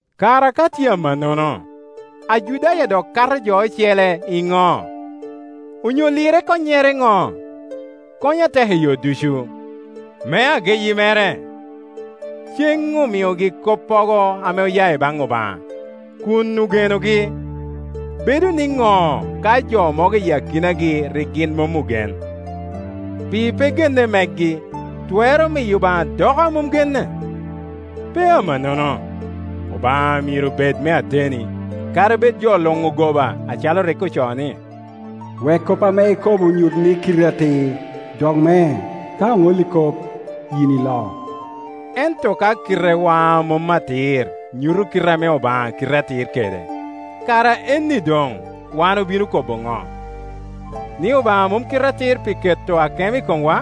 Kara ka tye amannono, Ajudaya dok kato jo ocele iŋo? Onyo lirre konnyere ŋo? Konyo atek i yo ducu. Me ageyi mere, ceŋ omiogi koppogo ame oya i baŋ Obaŋa, kun ogenogi. Bedo niŋo ka jo mogo i akinagi rik gin mom ogen? Pi pe genne megi twero miyo Obaŋa doko a mom genne? Pe amannono! Obaŋa myero bed me ateni, kadi bed jo luŋ ogoba, acalo rik ocoo ni, “Wek kop ame ikobo nyut ni kiti atir, dok me, ka oŋolli kop, yin ilo.” Ento ka kitewa a mom atir nyuto kit ame Obaŋa kite atir kede, kara enni doŋ wan obino kobo ŋo? Ni Obaŋa mom kite atir pi keto akemo i komwa?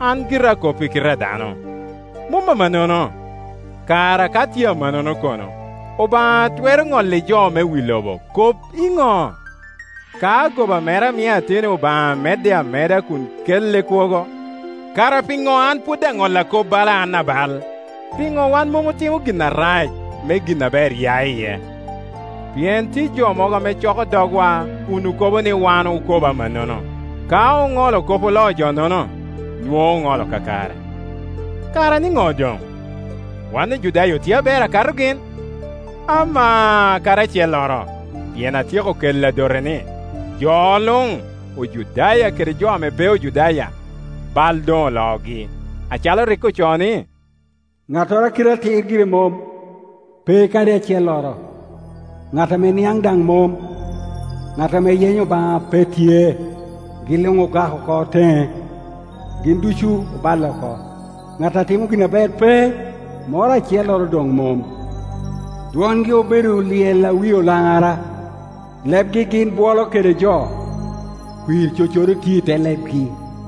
(An gira akop i kite a dano.) Mom amannono! Kara ka tye amannono kono, Obaŋa twero ŋolli jo me wi lobo kop iŋo? Ka goba mera miyo ateni Obaŋa medde ameda kun kelle kwogo, kara piŋo an pwod aŋolla kop bala an abal? Piŋo wan mom otimo gin arac me gin aber ya iye? Pien tye jo mogo ame coko dogwa kun okobo ni wan okobo amannono. Ka oŋolo kop oloo jo-nono, nwoŋo oŋolo kakare. Kara nino doŋ? Wan Ojudaya otye aber akato gin? Amaa, kadi acelloro; pien atyeko kelo adote ni, jo luŋ, Ojudaya kede jo ame pe Ojudaya, bal doŋ oloogi, acalo rik ocoo ni, “Ŋattoro a kite atir gire mom, pe kadi acelloro; ŋat ame niaŋ daŋ mom, ŋat ame yenyo Obaŋa pe tye. Gin luŋ doŋ ogak oko teŋe, gin ducu oballe oko; ŋat a timo gin aber pe, moro acelloro doŋ mom.” “Dwongi obedo lyel a wie olaŋara, lebgi gin bwolo kede jo.” “Kwir cocodo tye i te lebgi.”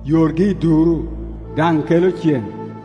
Yorgi i duru, daŋ kelo cen,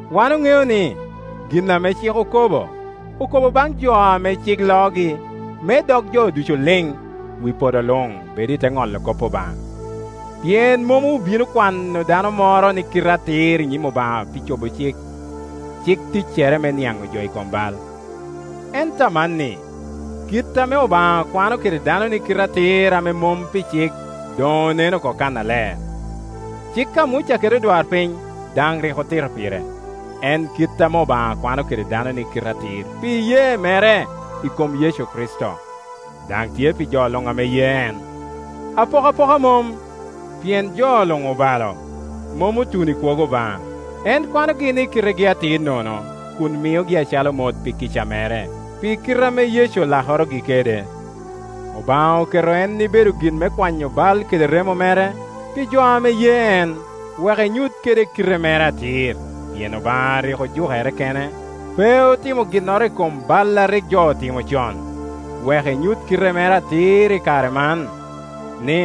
Wan oŋeo ni, gin ame cik okobo, okobo baŋ jo ame cik loogi, me dog jo ducu lin, wi podo luŋ bed i te ŋolo kop Obaŋa. Pien mom obino kwano dano moro ni kite atir i nyim Obaŋa pi cobo cik; cik ticcere me niaŋo jo i kom bal. Ento amanni kit ame Obaŋa kwano kede dano ni kite atir ame mom pi cik doŋ onen oko kannaler. Cik a Muca kede odwarpiny daŋ rik otito pire; en kit ame Obaŋa kwano kede dano ni kite atir pi iyee mere i kom Yecu Kricito, daŋ tye pi jo luŋ ame ye eno Apokapoka mom; pien jo luŋ obalo, mom otuno i kwogo Obaŋa. En kwanogi ni kitegi atir nono, kun miogi acalo mot pi kica mere, pi kite ame Yecu olakorogi kede. Obaŋa oketo en ibedo gin me kwanyo bal kede remo mere, pi jo ame ye en, wek enyut kede kite mere atir; pien Obaŋa rik ojukere kene, pe otimo ginnoro i kom bal a rik jo otimo con, wek enyut kite mere atir i kare man, ni,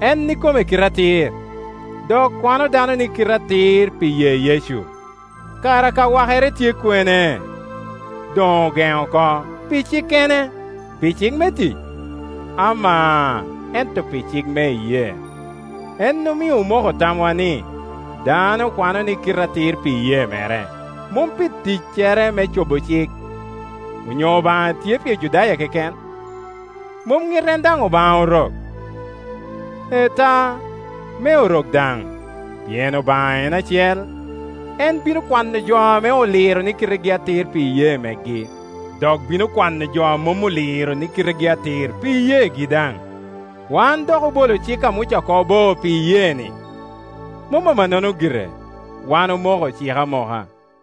en ikome kite atir, dok kwano dano ni kite atir pi ye Yecu. Kara ka wakere tye kwene? Doŋ ogeno oko. Pi cikkene? Pi cik me tic? Amaa, ento pi cik me iyee. En omio omoko tamwa ni, dano okwano ni kite atir pi iyee mere, mom pi ticcere me cobo cik. Onyo Obaŋa tye pi Ojudaya keken? Mom ŋit en daŋ Obaŋa Orok? Ee ta, me Orok daŋ, pien Obaŋa en acel; en bino kwano jo ame oliro ni kitegi atir pi iyee megi, dok bino kwano jo a mom oliro ni kitegi atir pi iyeegi daŋ. Wan dok obolo cik a Muca oko bo pi iyee-ni? Mom amanno gire, wan omoko cik amoka.